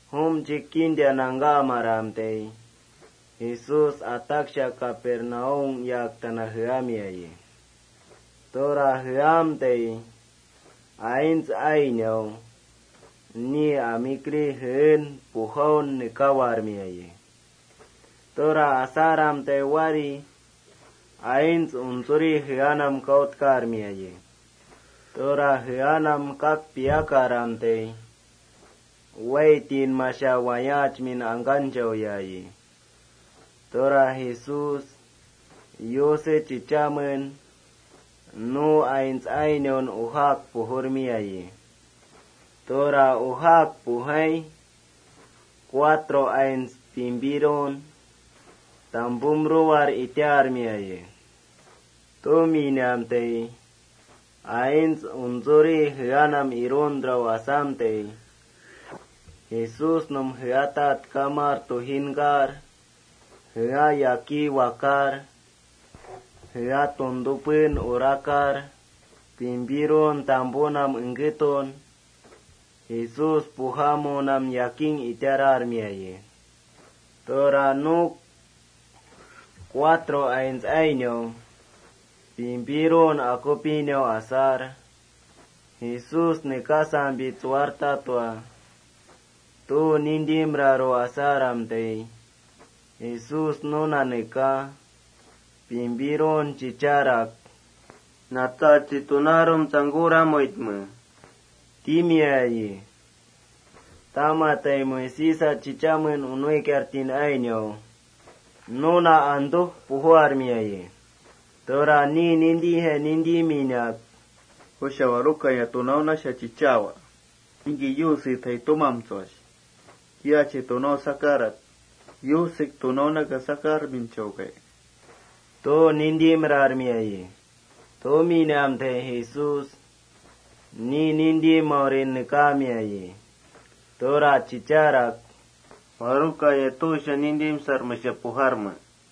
Jumchik kinta nangkamaramtai, Jesús ataksha Capernaum yaktanam jeamiayi. Tura jeamtai aints ainau ni amikri jeen pujaun nekaawarmiayi. Tura asaramtai aints untsuri jeanam wári kautkarmiayi. Tura jeanam kak piakaramtai, waaitinmasha wayaachmin angkanchauyayi. Tura Jesús Yuse chichamen nu aints ainaun ujaak pujurmiayi. Tura ujaak pujai, cuatro aints pimpirun tampumruwar itaarmiayi. Tuminamtai aints untsuri jeanam iruntraru asaramtai, Jesúsnum jeatatkamar tujinkar jea yakí wakaar patan urakar, pimpirun tampunam engketun Jesús pujamunam yakiya itararmiayi. Tura nu cuatro aints pimpirun akupinak: Jesús nekasampi tsuwartatua, tu nintimraru asaramtai, Jesús nuna nekaa, pimpirun chicharak: —Natsachi, tunaarum mash tsangkuramuitme, —timiayi. Tamati Moisésa chichamen nuikiartin ainau nuna antú pujuarmiayi. Tura ni nintijai nintiminak: “¿Jusha waruka tuusha chichaawa? ¿Ningki Yusetjai tumamtsuash? ¿Yusek tunaunaka sakarminchaukai?” tu nintimrarmiayi. Tuminamtai Jesús ni nintimaurin nekaamiayi. Tura chicharak: —¿Waruka tuusha nintimsarmesha pujarme?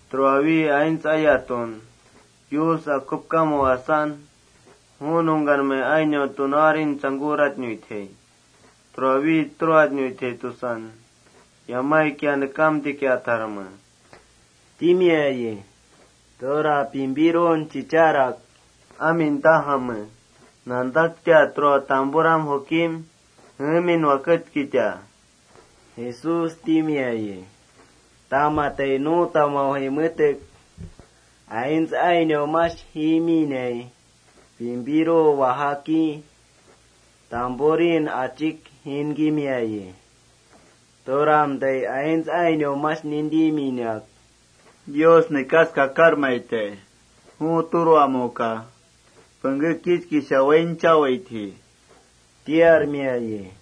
Tura wikia aints ayatun Yus akupkamu asan, ju nungkanam aints ainau tunaurin tsangkuratnuitjai. Tura wi turamnawaitjai tusan, yamaikia nekamtikiatjarme, —timiayi. Tura pimpirun chicharak: —Amin tajame: Nantakim tampuram jukim jeemin waketkita, —Jesús timiayi. Tamati nu tamaujai metek aints ainau mash jiminai, pimpiru wajaki tampurin juki jiinkimiayi. Turamtai aints ainau mash nintiminak: —Yus nekas kakarmaitai. Ju turamuka pengké kichkisha wainchawaitji, —tiarmiayi.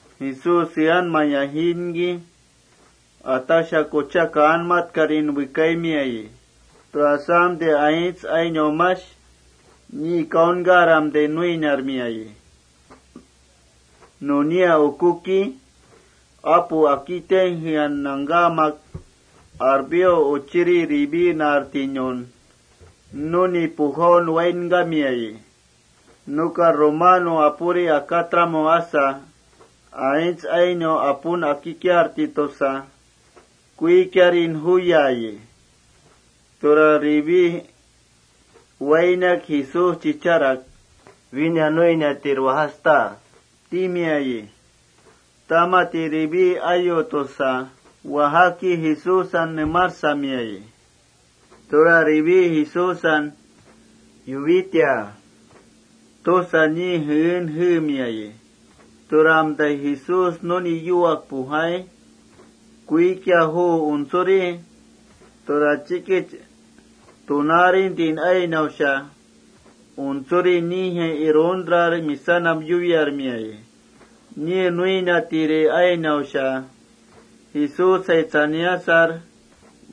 Jesús jeanmaya jiinki, ataksha kucha kaanmatkarin wekaimiayi. Tura asamtai aints ainau mash niin kautkaram nuiniarmiayi. Nunia ukuki, apu akitinam nangkamak, Alfeo uchiri Leví naartinun nuni pujaun wainkamiayi. Nuka romano apuri akatramu asa, aints ainau apun akikiarti tusa kuikian juyayi. Tura Levín wainak Jesús chicharak: —Wína nuiniatir ata, —tama Leví ayu tusa wajaki ni takatrinka mash ukuki Jesúsan nemarsamiayi. Tura Leví Jesúsan: Yuwita tusa ni jeen jeemiayi. Turamtai Jesús nuni yuwak pujai, kuikian juu untsuri, tura chikich tunaarintin ainausha untsuri nijai iruntrar misanam yuwiarmiayi. Ni nuiniatiri ainausha Jesúsjai tsaniasar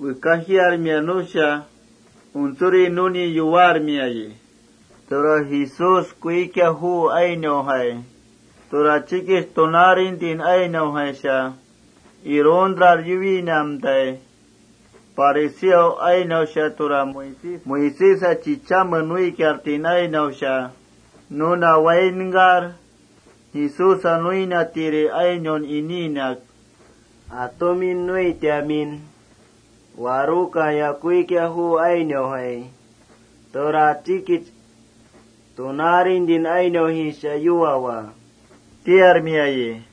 wekajiarmia nusha untsuri nuni yuwaarmiayi. Tura Jesús kuikian juu ainaujai, tura chikich tunaarintin ainaujaisha iruntrar yuwinamtai, fariseo ainausha, tura Moisésa chichame nuikiartin ainausha nuna wainkar, Jesúsa nuiniatiri ainaun iniinak: —¿Maj atumi nuitamin waruka kuikian juu ainaujai tura chikich tunaarintin ainaujaisha yuwawa? —tiarmiayi.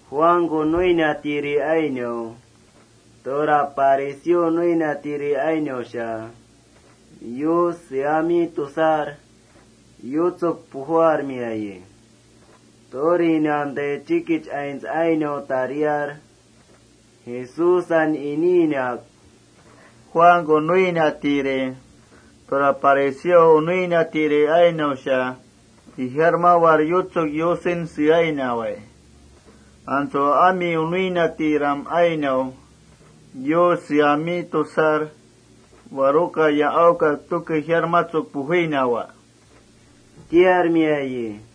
Juanku nuiniatiri ainau, tura fariseo nuiniatiri ainausha Yus seami tusar yutsuk pujuarmiayi. Turinamtai chikich aints ainau tariar, Jesúsan iniinak: —Juanku nuiniatiri tura fariseo nuiniatiri ainausha ijarmawar yutsuk Yusen seainawai. ¿Antsu ami nuiniatiram ainau Yus seami tusar waruka ijarmatskesha pujuinawa? —tiarmiayi.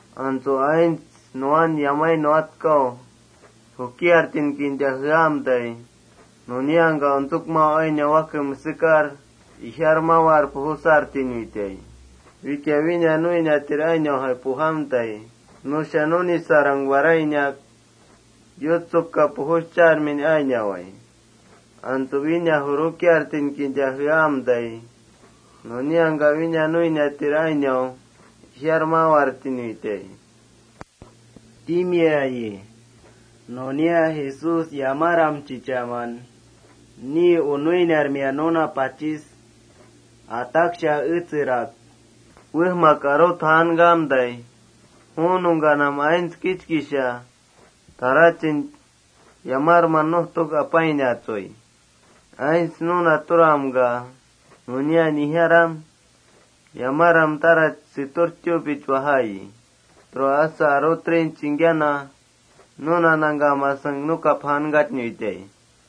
Antsu aints nuwan yamai nuwatkamun jukiartin kinta jeamtai, nuniangka untsukmau ainau wake mesekar ijarmawartinuitai. Wikia wína nuiniatir ainaujai pujamtai, nusha nunisarang warainak yutsukka pujuschartin ainawai. Antsu wína jurukiaramtai, nuniangka ijarmawartinuitai, —timiayi. Nunia Jesús yamaram chichaman ni nuiniarmia nuna pachis ataksha etserak: “Wejmak arut jaankamtai, ju nungkanam aints kichkisha tarachin yamarman nujtuk apainatsui. Antsu nu turamka, nunia nijaram yamaram tarach setur tuupich wajaayi, tura asa arutrin chingkiana nuna nangkamasang nukap jaankatnuitai.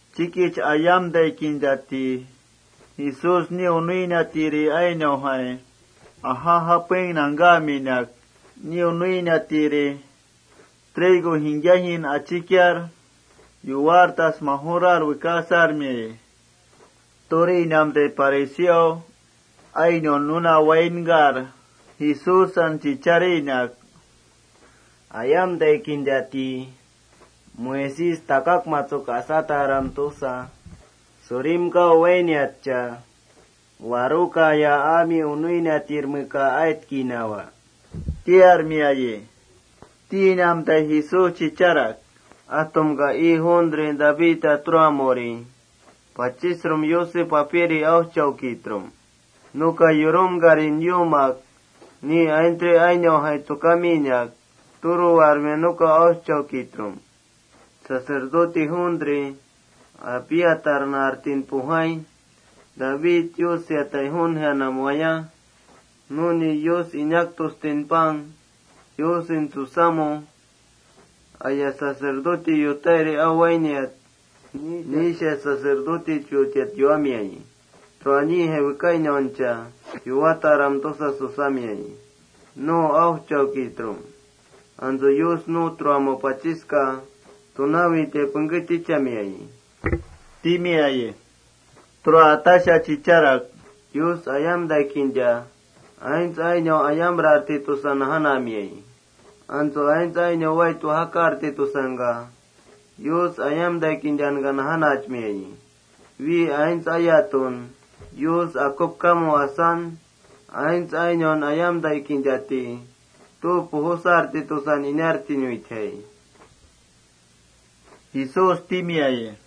Chikich ayamtai kintati Jesús ni nuiniatiri ainaujai aja japeng nangkaminak, ni nuiniatiri trigo jingkiajin achikiar majurar yukiar wearmiayi. Turinamtai fariseo nuna wainkar, Jesúsan chicharinak: —Ayamtai kintati Moisés takakmatsuk asataram tusa surimkau wainiatcha ¿warukaya ami nuiniatirmeka aitkinawa? —tiarmiayi. Tinamtai Jesús aimiak: —¿Atumka ii juuntri Davidta turamuri pachisrum Yuse Papiri aujchaukitrum? ¿Nuka yurumkan yuumak ni aintsri ainaujai tsukaminak turuwarmia nuka aujchaukitrum? Sacerdote apuri, Abiatar naartin pujai, David Yus seatai juun jeanam waya, nuni Yus inaktustin pang Yus susamu, aya sacerdote yutairi au wainiat, nisha sacerdotechutiat yuwamiayi. Tura nijai wekainauncha: Yuwataram tusa susamiayi. Antsu Yus nu turamu pachiska tunaawitai tichamiayi, —timiayi. Tura ataksha chicharak: —Yus ayamtai kinta aints ainau ayamrarti tusa najanamiayi. Antsu aints ainau wait wajakarti tusangka, Yus ayamtai kintanka najanachmiayi. Wi aints ayatun Yus akupkamu asan, aints ainaun ayamtai kintati tu pujusarti tusan inartinuitjai, —Jesús timiayi.+